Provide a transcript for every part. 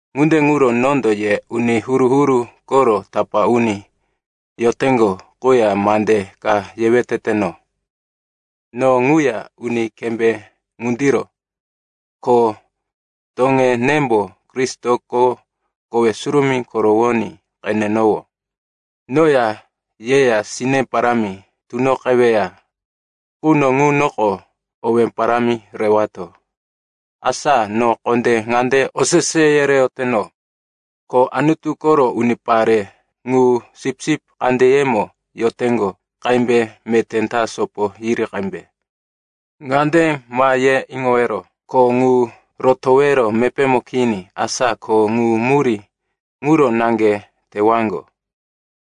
Ŋunde ŋuro nondo ye uni huru-huru koro tapá uni yoteŋgo quya mande ka yewe teteno. No ŋuya uni kembé ŋundiro, ko toŋenembo Kristoko kowe surumí korowoní qenenowó. Noya yeya sine parámi tunoqeweya quno ŋunoko owé parámi rewato. Asa no kondé ŋande osese yereyoteno, ko Anutu koro unipare ŋu sipsip kandeyemo yoteŋgo qembe meté ta sopo yiri qembe. Ŋande ma ye iŋowero, kho ŋu rotowero mepémo kini, asa ko ŋu murí ŋuro naŋge tewaŋgo.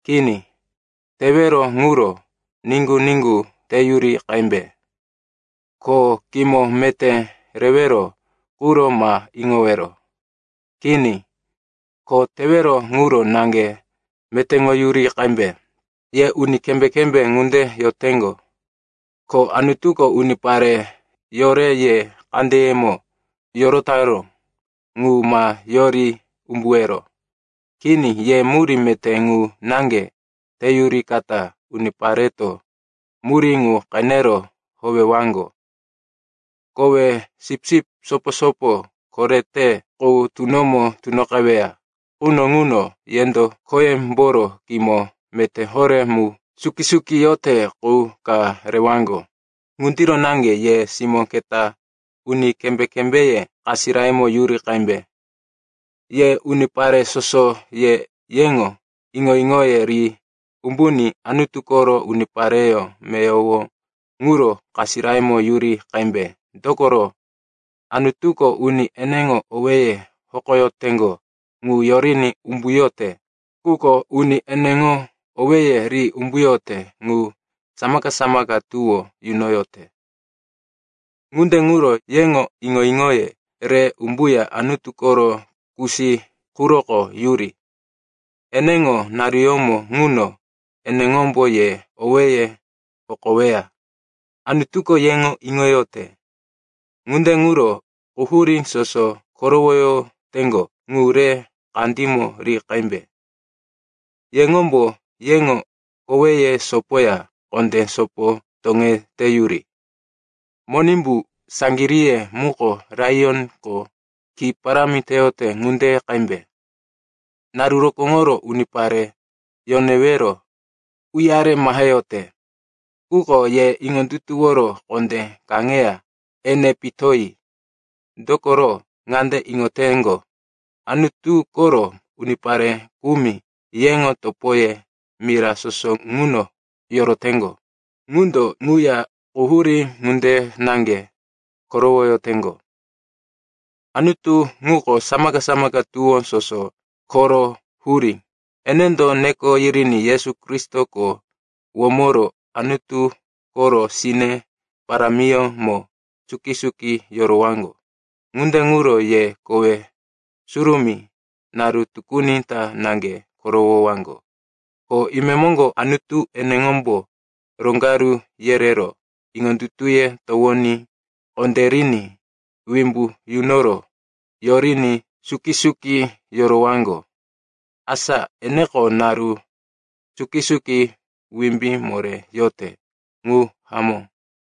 Kini, tewero ŋuro niŋgu-niŋgu teyuri qembe. Ko kimo meté rewero quro ma iŋowero. Kini, kho tewero ŋuro naŋge metéŋoyuri qembe. Ye uni kembé-kembé ŋunde yoteŋgo, ko Anutuko unipare yore ye kandeyemo yorotaró ŋu ma yori umbuwero. Kini, ye murí meté ŋu naŋge teyurikata unipareto murí ŋu qenero howewaŋgo. Kowe Sipsip Sopo-sopo Korete Qu tunomo tunoqeweya quno ŋuno, yendo khoyemboro kimo meté horé mu suki-suki yote qu ka rewaŋgo. Ŋundiro naŋge ye simó keta, uni kembé-kembéye kasirayemo yuri qembe. Ye unipare soso, ye yeŋo iŋo-iŋoye ri umbuní Anutu koro unipareyó meyowo ŋuro kasirayemo yuri qembe. Dokoro, “Anutuko uni eneŋo owéye hokoyoteŋgo ŋu yoriní umbuyote, quko uni eneŋo owéye ri umbuyote ŋu samaka-samaka tuwó yunoyote.” Ŋunde ŋuro yeŋo iŋo-iŋoye re umbuya Anutu koro kusí quroko yuri. Eneŋo naruyómo ŋuno eneŋombo ye owéye hokoweya. Anutuko yeŋo iŋoyote. Ŋunde ŋuro quhurí soso korowoyoteŋgo ŋu re kandímo ri qembe. Yeŋombo yeŋo koweye sopoya kondé sopo toŋeteyuri. Monimbu, saŋgiríye muko laiyonko ki parámi teyote ŋunde qembe. Naru rokóŋoro unipare yonewero uyare maheyote. Quko ye iŋondutuworo kondé kaŋeya ene pitoyi. Dokoro ŋande iŋoteŋgo, Anutu koro unipare kumi, yeŋo topoye mira soso ŋuno yoroteŋgo, ŋundo ŋuya quhurí ŋunde naŋge korowoyoteŋgo. Anutu ŋuko samaka-samaka tuwó soso koro hurí. Enendo neko yiriní Yesu Kristoko womoro Anutu koro sine parámiyómo suki-suki yorowaŋgo. Ŋunde ŋuro ye kowe surumí naru tukuni ta naŋge korowowaŋgo, ko imemoŋgo Anutu eneŋombo roŋgaru yerero, iŋondutuye towoní kondériní, wimbu yunoro, yoriní suki-suki yorowaŋgo. Asa eneko naru suki-suki wimbí moré yote. Ŋu hamó.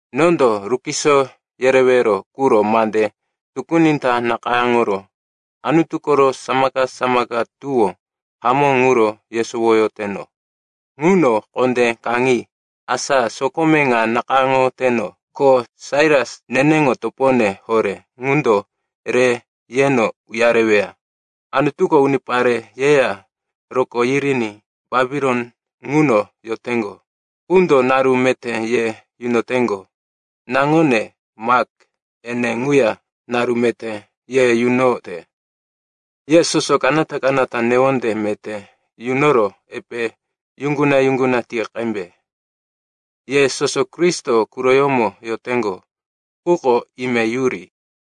Nondo rukiso yerewero quro mande tukuni ta nakayáŋoro Anutu koro samaka-samaka tuwó hamó ŋuro yesowoyoteno. Ŋuno kondé kaŋi. Asa sokome ŋa nakayáŋoteno, ko Sailas, neneŋo topone horé, ŋundo re yeno uyareweya. Anutuko unipare yeya rokó yiriní Bapilon ŋuno yoteŋgo qundo naru meté ye yunoteŋgo. Naŋone, Mak, ene ŋuya naru meté ye yunote. Ye soso kanata-kanata newonde meté yunoro epe yuŋguna-yuŋguna ti qembe. Ye soso Kristo quroyómo yoteŋgo quko ime yuri.